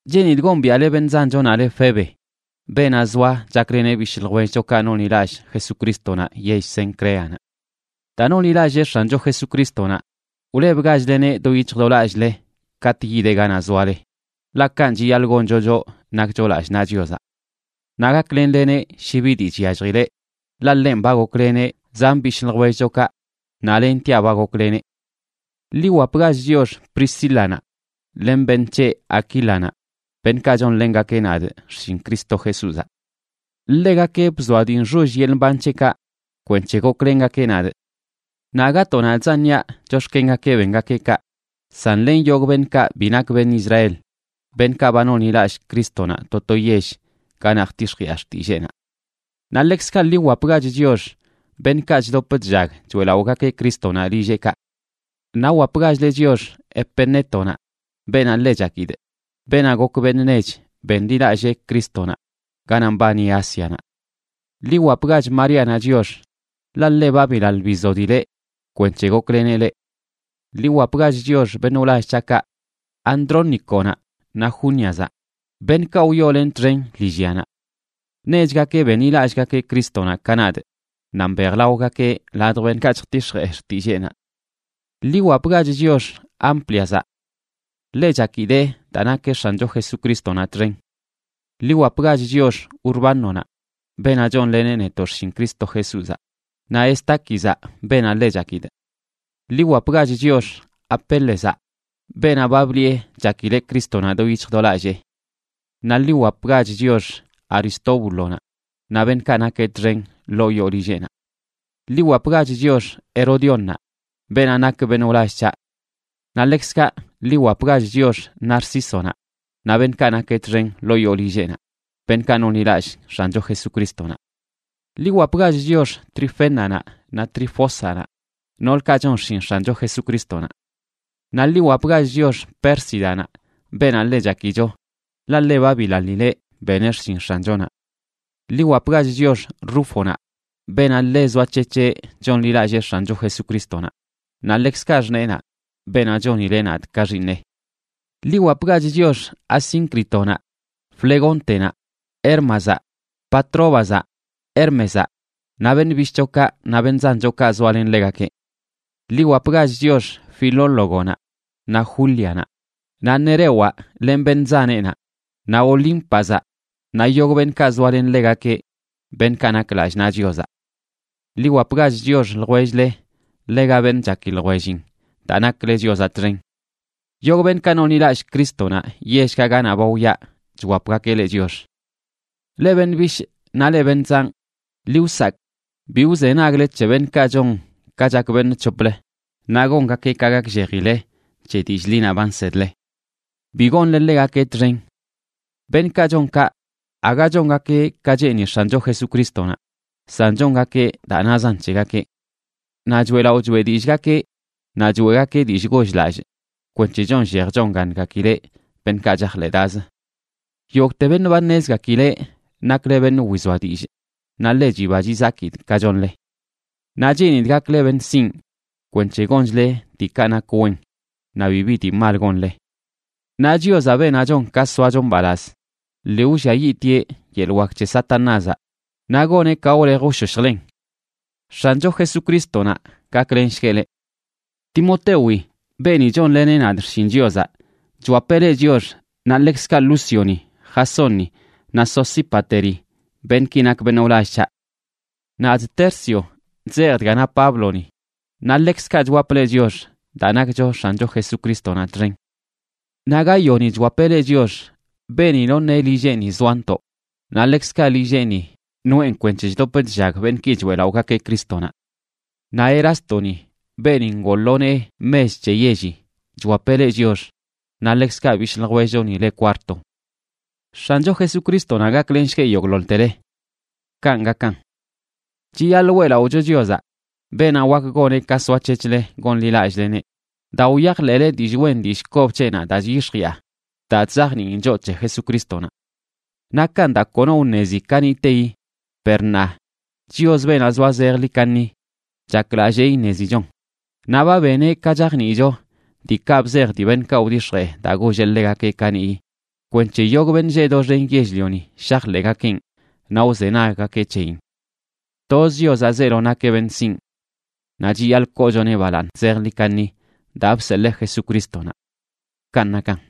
Cheenidꞌ gombiaꞌle beṉꞌ zanchonaꞌ le Febe, beenaꞌ zoa chakleneꞌ bishꞌ ljwellchokaꞌ nonḻilallꞌ Jesucrístonaꞌ yell Cencreanaꞌ. Daa nonḻilallee X̱ancho Jesucrístonaꞌ, wlebgachleneꞌ do yic̱hj do lallꞌle katꞌ yideꞌ ganaꞌ zoale, ḻaꞌ kanꞌ chiyaḻꞌ goncho, choꞌ nakcho lallꞌ naꞌ Chiozaꞌ. Naꞌ gaklenleneꞌ shi bi dii chyalljileꞌ, ḻaꞌ ḻenꞌ ba gokleneꞌ zan bishꞌ ljwellchokaꞌ naꞌ lentiaꞌ ba gokleneꞌ. Ḻi wwapgach chiox Priscílanaꞌ len beṉꞌ c̱heꞌ, Aquílanaꞌ, beṉꞌkaꞌ chonlengakeꞌ nadꞌ xshin Cristo Jesúzaꞌ. Ḻegakeꞌ bzoa dii nxoll yeḻꞌ mban c̱heꞌkaꞌ kwenc̱he goklengakeꞌ nadꞌ. Naꞌ aga to nadꞌzan niaꞌ chox̱kengakeꞌ bengakeꞌ kaꞌ, san len yogꞌ beṉꞌkaꞌ bi nak beṉꞌ Israel, beṉꞌkaꞌ ba nonḻilallꞌ Crístonaꞌ to to yell ganaꞌ jtix̱jiꞌa xtilleenaꞌ. Naꞌ ḻekzkaꞌ ḻi wwapgach chiox beṉꞌkaꞌ chdop chllag choeꞌlaꞌogakeꞌ Crístonaꞌ lilleꞌkaꞌ. Naꞌ wwapgachle chiox Epenétonaꞌ, beenaꞌ ḻe chakidꞌ, beenaꞌ gok beṉꞌ nech benḻilallee Crístonaꞌ ganaꞌ mbani Ásianaꞌ. Ḻi wwapgach Maríanaꞌ chiox, ḻaꞌ ḻe ba bilaḻ bizodileꞌ kwenc̱he gokleneꞌ leꞌ. Ḻi wwapgach chiox beṉꞌ wlall c̱haꞌkaꞌ Andróniconaꞌ naꞌ Júniazaꞌ, beṉꞌkaꞌ wyoolenꞌ txen lillyanaꞌ. Nechgakeꞌ benḻilallꞌgakeꞌ Crístonaꞌ ka nadꞌ, naꞌ mbejlaogakeꞌ ladj beṉꞌkaꞌ chjtix̱jee xtilleenaꞌ. Ḻi wwapgach chiox Ámpliazaꞌ. Ḻe chakidee daa nakeꞌ X̱ancho Jesucrístonaꞌ txen. Ḻi wwapgach chiox Urbánonaꞌ, beenaꞌ chonleneꞌ netoꞌ xshin Cristo Jesúzaꞌ, naꞌ Estáquizaꞌ, beenaꞌ ḻe chakidꞌ. Ḻi wwapgach chiox Apélezaꞌ, beenaꞌ ba bliꞌe chakileꞌ Crístonaꞌ do yic̱hj do lallee. Naꞌ ḻi wwapgach chiox Aristóbulonaꞌ naꞌ beṉꞌkaꞌ nakeꞌ txen ḻoo yoo lilleꞌnaꞌ. Ḻi wwapgach chiox Herodiónnaꞌ, beenaꞌ nak beṉꞌ wlall c̱haꞌ. Naꞌ ḻekzkaꞌ ḻi wwapgach chiox Narcísonaꞌ naꞌ beṉꞌkaꞌ nakeꞌ txen ḻoo yoo lilleꞌnaꞌ, beṉꞌkaꞌ nonḻilallꞌ X̱ancho Jesucrístonaꞌ. Ḻi wwapgach chiox Trifénanaꞌ naꞌ Trifósanaꞌ, noolkaꞌ chon xshin X̱ancho Jesucrístonaꞌ. Naꞌ ḻi wwapgach chiox Pérsidanaꞌ, beenaꞌ ḻe chakicho, ḻaꞌ ḻe ba bilaḻileꞌ beneꞌ xshin X̱anchonaꞌ. Ḻi wwapgach chiox Rúfonaꞌ beenaꞌ ḻe zoac̱hec̱heꞌ chonḻilallee X̱ancho Jesucrístonaꞌ, naꞌ ḻekzkaꞌ xṉeenaꞌ, beenaꞌ chonileꞌ nadꞌ ka xiiṉeꞌ. Ḻi wwapgach chiox Asíncritonaꞌ, Flegóntenaꞌ, Hérmazaꞌ, Patróbazaꞌ, Hérmezaꞌ naꞌ beṉꞌ bishꞌchokaꞌ naꞌ beṉꞌ zanchokaꞌ zoalen ḻegakeꞌ. Ḻi wwapgach chiox Filólogonaꞌ naꞌ Júlianaꞌ, naꞌ Nerewaꞌ len beṉꞌ zaneꞌnaꞌ, naꞌ Olímpazaꞌ naꞌ yogꞌ beṉꞌkaꞌ zoalen ḻegakeꞌ, beṉꞌkaꞌ nak lallꞌ naꞌ Chiozaꞌ. Ḻi wwapgach chiox ljwell-le ḻega beṉꞌ chaki ljwellin daa nakle Chiozaꞌ txen. Yogꞌ beṉꞌkaꞌ nonḻilallꞌ Crístonaꞌ yellkaꞌ ganaꞌ ba wyaꞌ chwapgakeꞌ leꞌ chiox. Leꞌ beṉꞌ bishꞌ naꞌ leꞌ beṉꞌ zanꞌ, ḻi wsakꞌ bi wzenagle c̱he beṉꞌkaꞌ chon ka chak beṉꞌ c̱hoplə, naꞌ gongakeꞌ ka gakllejile c̱he dillꞌ ḻinaꞌ ba nsedle. Bi gonle ḻegakeꞌ txen. Beṉꞌkaꞌ chon kaꞌ aga chongakeꞌ ka cheeni X̱ancho Jesucrístonaꞌ, san chongakeꞌ daa nazan c̱hegakeꞌ. Naꞌ choeꞌlaꞌo choeꞌ dillꞌgakeꞌ naꞌ choeꞌgakeꞌ dillꞌ goll-lallꞌ kwenc̱he chonllej chongaṉgakileꞌ beṉꞌkaꞌ chajḻeꞌdaz. Yogꞌte beṉꞌ ba ṉezgakileꞌ nakle beṉꞌ wizoa dillꞌ, naꞌ ḻe chiba chizakidꞌ ka chonle. Naꞌ cheenidꞌ gakle beṉꞌ sinꞌ kwenc̱he gonchle diikaꞌ nak wen naꞌ bibi dii mal gonle. Naꞌ Chiozaꞌ, beenaꞌ chon ka soacho mbalaz, lii wlliayiꞌtieꞌ yeḻꞌ wak c̱he Satanázaꞌ naꞌ goneꞌ ka wlej wshoshjlen. X̱ancho Jesucrístonaꞌ gaklenshgueꞌ leꞌ. Timotewi, beeni chonleneꞌ nadꞌ xshin Chiozaꞌ, chwapeꞌ leꞌ chiox naꞌ ḻekzkaꞌ Lúcioni, Jasónni naꞌ Sosípateri, beṉꞌki nak beṉꞌ wlall c̱haꞌ. Nadꞌ, Tercio, chzejꞌ dga na Pábloni, naꞌ ḻekzkaꞌ chwapꞌ leꞌ chiox daa nakcho X̱ancho Jesucrístonaꞌ txen. Naꞌ Gáyoni chwapeꞌ leꞌ chiox, beeni noṉeꞌ lilleꞌni zoantoꞌ, naꞌ ḻekzkaꞌ lilleꞌni noꞌen kwenc̱he chdop chllag beṉꞌki choeꞌlaꞌogakeꞌ Crístonaꞌ. Naꞌ Erástoni, beeni ngoo lo nee mech c̱he yelli, chwapeꞌ leꞌ chiox, naꞌ ḻekzkaꞌ bishꞌ ljwellchoni le Cuarto. X̱ancho Jesucrístonaꞌ gaklenshgueꞌ yogꞌḻoḻtele. Kanꞌ gakan. Chiyaḻꞌ weꞌlaꞌocho Chiozaꞌ, beenaꞌ wak goneꞌ ka soac̱hec̱hle gonḻilallꞌleneꞌ daa wyajḻeꞌle dillꞌ wen dillꞌ kob c̱heꞌnaꞌ daa chyix̱jiꞌa, daa chzajniin choꞌ c̱he Jesucrístonaꞌ. Nakan daa kono wṉezi kaniꞌteyi, per ṉaa, Chios, beenaꞌ zoa zejḻi kaṉi, chaklallee iṉezichon, naꞌ ba beneꞌ ka chajniicho diikaꞌ bzej dii beṉꞌkaꞌ wdix̱jee daa golleꞌ ḻegakeꞌ kaniꞌyi kwenc̱he yogꞌ beṉꞌ lleꞌ doxen yell-lioni shajḻeꞌgakeꞌn naꞌ wzenaggakeꞌ c̱heyin. Toz Chiozaꞌ zeelo nakeꞌ beṉꞌ sinꞌ. Naꞌ chiyaḻꞌ koochoneꞌ balaaṉ zejḻi kaṉi daa bseḻee Jesucrístonaꞌ. Kanꞌ nakan.